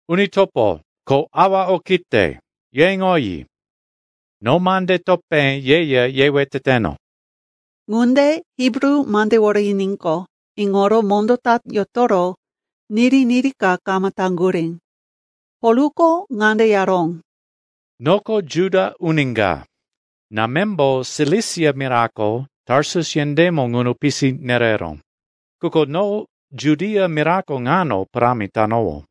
“Uni topo ko awa okite, ye iŋoyi. No mande topé yeya yewe teteno.” Ŋunde Hibru mandewore yiníqo, iŋoro mondó ta yotoro niri-niri ka kama taŋgurí. Polko ŋande yaró, “Noko Juda uni ka. Námembo Silisia mirako Tarsus yendémo ŋuno pisi nereró, quko no Judia mirako ŋano parámi tanowó.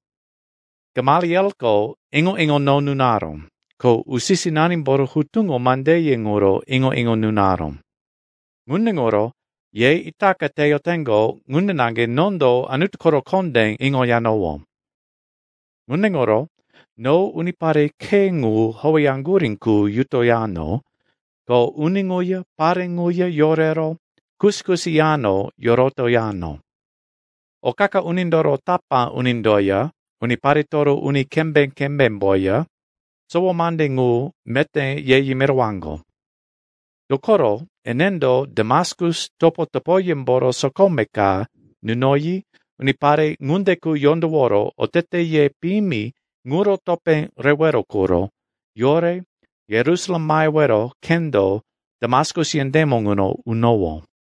Gamalielko iŋo-iŋo no nunaró, ko usi-sinanimboro hutuŋo mandeye ŋuro iŋo-iŋo nunaró. Ŋunde ŋuro ye itaka teyoteŋgo ŋunde naŋge nondo Anutu koro kondé iŋoyanowó. Ŋunde ŋuro no unipare Khe ŋu howeyaŋgurí qu yutoyano, ko uni ŋuya pare ŋuya yorero kusi-kusi yano yorotoyano. O qa-qa unindoro tapá unindoya uniparetoro uni kembé-kembémboya, sowo mande ŋu meté ye yimirowaŋgo. Dokoro enendo Damaskus topo-topoyemboro sokome ka nunoyi unipare ŋunde qu yondoworo oteteye piyimi ŋuro topé rewero quro yore Yerusalem mahewero khendo Damaskus yendémo ŋuno unowó.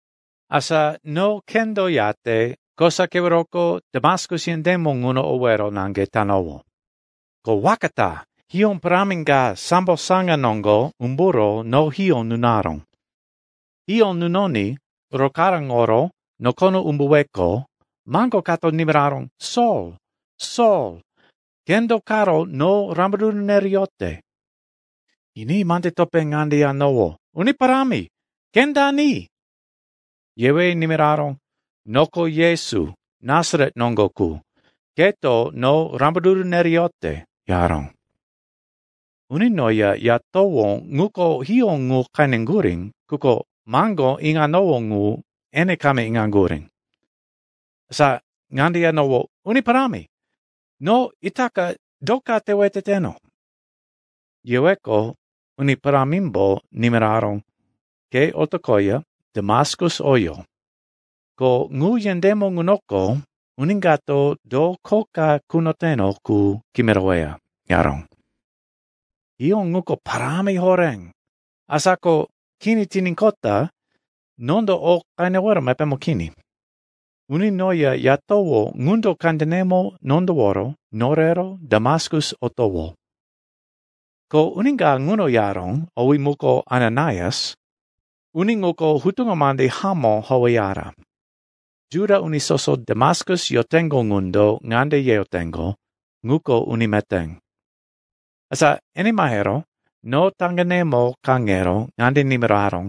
“Asa no khendo yate kosa keweroko Damaskus yendémo ŋuno owero naŋge tanowó. Ko waka ta hiyó parámi ka sambo saŋa noŋgo umburo no hiyó nunaró. Hiyó nunoní rokaráŋoro nokono umbuweqo, maŋgo kato nimiraró, ‘Sol, Sol, ke do karo no rambaruru nereyote?’ “Yiní mande topé ŋande yanowó, ‘Uni parámi, ke dani?’ “Yewe nimiraró, ‘Noko Yesu, Nasaret noŋgo qu, keto no rambaruru nereyote,’ yaró. Uni noya yatowó ŋuko hiyó ŋu qeneŋgurí, quko maŋgó iŋanowó ŋu ene kama iŋaŋgurí. “Asa ŋande yanowó, ‘Uni Parámi, no itaka do ka tewe teteno?’ “Yeweqo, Uni Parámimbo nimiraró, ‘Ke otoqoya Damaskus oyo. Ko ŋu yendémo ŋunoko uni kato do kho ka kunoteno qu kimiroweya,’ yaró. Hiyó ŋuko parámi horé, asa ko kini tiníqota nondo o qenewero mepémo kini. Uni noya yatowó ŋundo kandenemo nondoworo norero Damaskus otowó. “Ko uni ka ŋuno yaró, owí muko Ananaias. Uni ŋuko hutuŋo mande hamó howeyara. Juda uni soso Damaskus yoteŋgo ŋundo ŋande yeyoteŋgo, ŋuko uni meté. Asa ene mahero no taŋgenemo kaŋero ŋande nimiraró,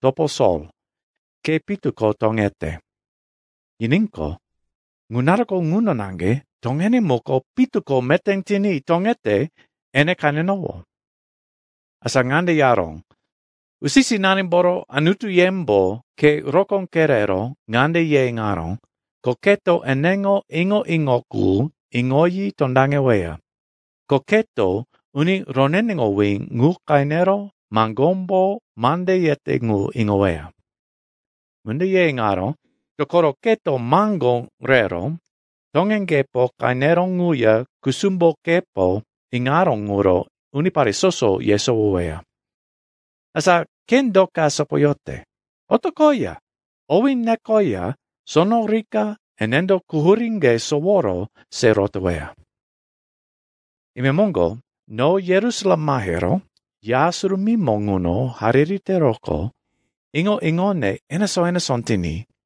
‘Topo Sol, ke pitu ko toŋete.’ Yiníqo, ŋu naruko ŋuno naŋge toŋene muko pitu ko meté tiní toŋete ene qenenowó. “Asa ŋande yaró, ‘Usi-sinanimboro Anutuyembo ke rokó kerero ŋande ye iŋaró, ko keto eneŋo iŋo-iŋo qu iŋoyi tondaŋeweya, ko keto Uni Roneneŋowí ŋu qenero maŋgómbo mande yete ŋu iŋoweya. Ŋunde ye iŋaró, dokoro keto maŋgó rero toŋeŋgepo qeneró ŋuya kusumbokepo iŋaró ŋuro unipare soso yesowoweya. Asa ke do ka sopoyote? Otoqoya owí nekoya sono rika enendo quhuríŋge soworo se rotoweya.’ “Imemoŋgo no Yerusalem mahero Ya Surumímo ŋuno hariri teroqo, iŋo-iŋone enesó-enesó tiní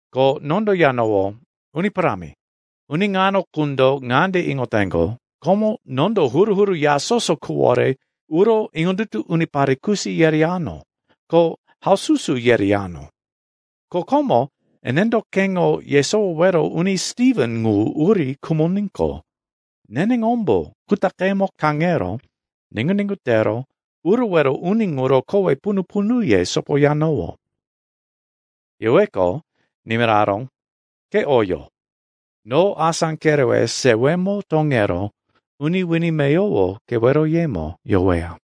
“Ko nondo yanowó, ‘Uni Parámi, uni ŋano qundo ŋande iŋoteŋgo, komo nondo huru-huru ya soso quwore uro iŋondutu unipare kusi yereyano, ko haususu yereyano. Ko komo enendo keŋo yesowowero uni Stiven ŋu uri khumoníqo, neneŋombo kutaqemo kaŋero niŋgu-niŋgu tero urowero uni ŋuro kowe punu-punuye sopoyanowó.’ “Yeweqo, nimiraró, ‘Ke oyo. No asá kerewe sewemo toŋero uni wini meyowo keweroyemo yoweya.’”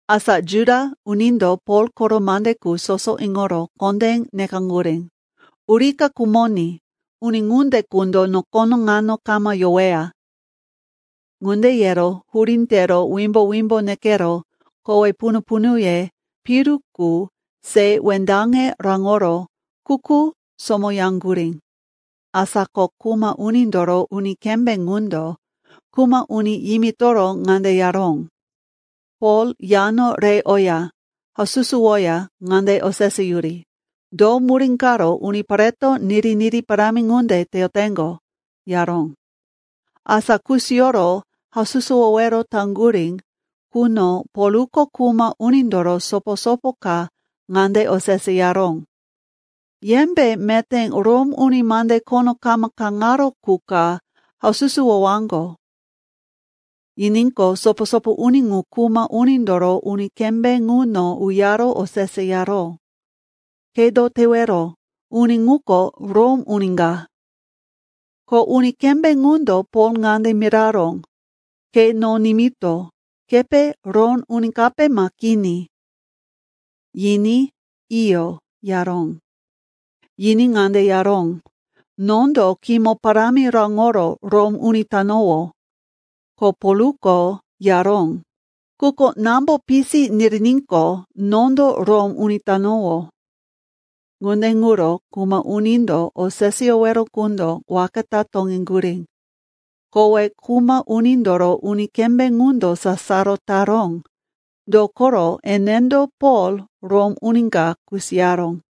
Asa Juda unindo Pol koro mande qu soso iŋoro kondé nekaŋgurí, “Urika khumoní! Uni ŋunde qundo nokono ŋano kama yoweya!” Ŋunde yero hurí tero wimbo-wimbo nekero kowe punu-punuye piru qu se wendaŋe raŋoro kuku somoyaŋgurí. Asa ko kuma unindoro uni kembé ŋundo kuma uni yimitoro ŋande yaró, “Pol yano re oya haususuwoya ŋande oseseyuri, do murí karo unipareto niri-niri parámi ŋunde teyoteŋgo,” yaró. Asa kusiyoro haususuwowero taŋgurí quno Polko kuma unindoro sopo-sopo ka ŋande oseseyaró, “Yembe meté Rom uni mande khono kama kaŋaró qu ka haususuwowaŋgo?” Yiníqo, sopo-sopo uni ŋu kuma unindoro uni kembé ŋuno uyaro oseseyaró, “Ke do tewero? Uni ŋuko Rom uni ka.” Ko uni kembé ŋundo Pol ŋande miraró, “Ke no nimito. Kepe Rom uni kape ma kini?” Yiní, “Iyo,” yaró. Yiní ŋande yaró, “Nondo kimo parámi raŋoro Rom uni tanowó.” Ko Polko yaró, “Quko námbo pisi niriníqo, nondo Rom uni tanowó.” Ŋunde ŋuro kuma unindo oseseyowero qundo waka ta toŋeŋgurí. Kowe kuma unindoro uni kembé ŋundo sasaro taró. Dokoro enendo Pol, Rom uni ka, kusiyaró.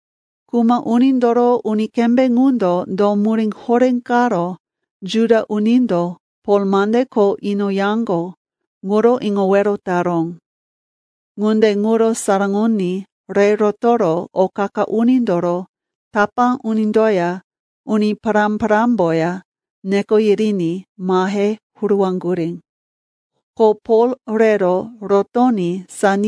Kuma unindoro uni kembé ŋundo do murí horé karo Juda unindo Pol mande kho inoyaŋgo ŋuro iŋowero taró. Ŋunde ŋuro saraŋoní re rotoro o qa-qa unindoro tapá unindoya uni pará-parámboya neko yiriní mahe huruwaŋgurí. Ko Pol rero rotoní.